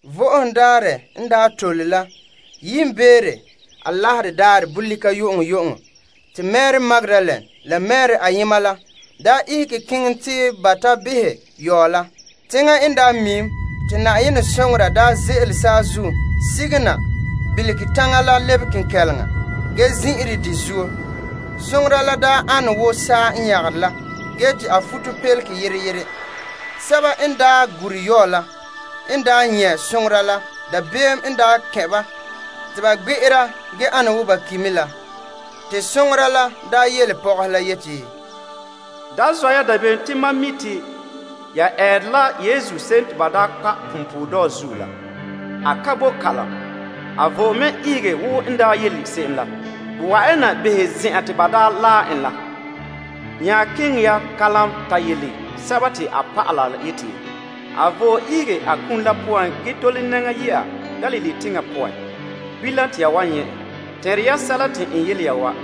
Vo'ohogo Daarɛ la n daa tole la yiimbeere Alaherɛ daarɛ bolika yu'uŋyu'uŋɔ, te Mari Magdalene la Mari ayema la daa ihege keŋɛ te ba ta behɛ yɔɔ la. Teŋa n miim, te Na'ayenɛ soŋora ze'ele saazuo sige na bilige taŋa la lebe kenkɛleŋa ge zin'ire de zuo. Soŋora la ane wo saa n nyagere la ge te a futopelege yere yere. Sɛba n gure yɔɔ la n nyɛ' soŋora la, dabeem n kɛn' ba, te ba gbe'era ge ana wo ba ki' me la. Te soŋora la yele pɔgɔhe la yeti, Da zɔ' ya dabeem te mam mi' te ya eere la Yesu se'em te ba daa kpa' punpuuredɔɔ zuo la. A ka bo kalam. A vo'e mɛ ihege wo a daa yele se'em la. Wa'an ya na behɛ zen'an te ba daa laɛ en ge nya keŋɛ ya kalam ta yele a dɔlɔba la te a vo'e ihege a kum la poan gee tole nɛŋa yɛ'a Galilee teŋa poan. Bilam te ya wan nyɛ' en. Te n yele ya wa.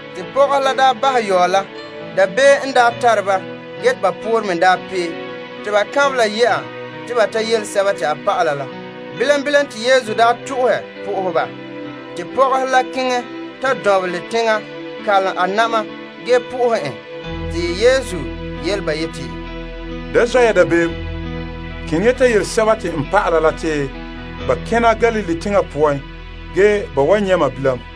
Te pɔgɔhe la bahɛ yɔɔ la. Dabeem n tare ba ge te ba poore me pee te ba kanbela yɛ'a te ba yele a dɔlɔba la. Bilam bilam te Yesu to'ohe po'ohɛ ba. Pɔgɔhe la dɔnbelɛ teŋa kalom a na'ma na'ahe en. Yesu nya yele ba yeti, Da zɔ' ya dabeem. Keŋɛ ya ta yele n dɔlɔba la te ba kena Galilee teŋa poan ge ba wan nyɛ' mam bilam.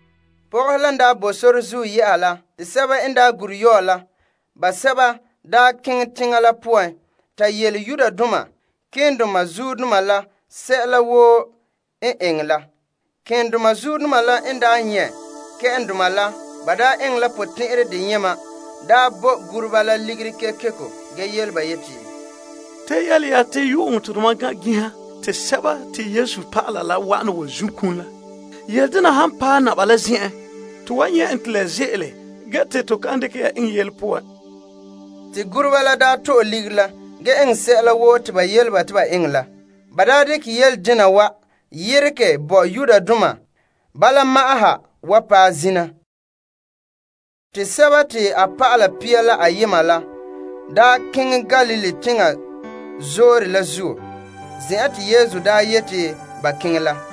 Pɔgɔhe la n daa boe sore la zuo yɛ'a la, sɛba n daa gure yɔɔ la basɛba keŋɛ teŋa la poan ta yele malema keendoma la sɛla woo n eŋɛ la. Malema keendoma la n nyɛ' kpɛ'ɛndoma la eŋɛ la potɛn'ɛrɛ deyema, ba bo guruba la ligiri kekeko, ge yele ba yeti, Ta yele ya te yu'uŋɔ te tomam gan'an ginha te Yesu dɔlɔba la wa'ana zun' kum la. Yele dena han paɛ Naba la zen'en, to wan nyɛ' en te la ze'ele ge te to kan dekɛ ya eŋɛ yele poan. Te guruba la to'e ligiri la eŋɛ sɛla woo te ba yele ba te ba eŋɛ la. Ge ba dekɛ yele dena wa yeregɛ bo Yudoma bala ma'an ha wa paɛ zina. Te dɔlɔba pia la ayema la keŋɛ Galilee teŋa zoore la zuo, zen'an te Yesu yeti ba keŋɛ la.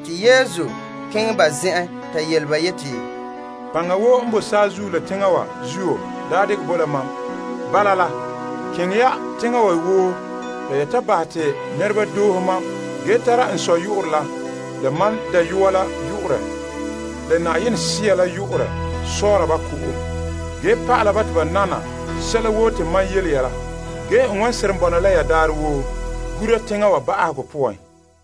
Yesu nya keŋɛ ba zen'en ta yele ba yeti, Yenɛ dekɛ paŋa woo n boe saazuo la teŋa wa zuo bo la mam. Bala la, keŋɛ ya teŋhe woo la bahɛ te nɛreba doohe mam. Tara n Sɔ' la yu'urɛ, la mam Dayɔa la yu'urɛ, la Na'ayenɛ Sea la yu'urɛ sɔɔra ba ko'om. Pa'ala ba te ba nana sɛla woo te mam yele ya la. Ge n wan seren bɔna la ya daarɛ woo gura teŋa wa ba'ahegɔ.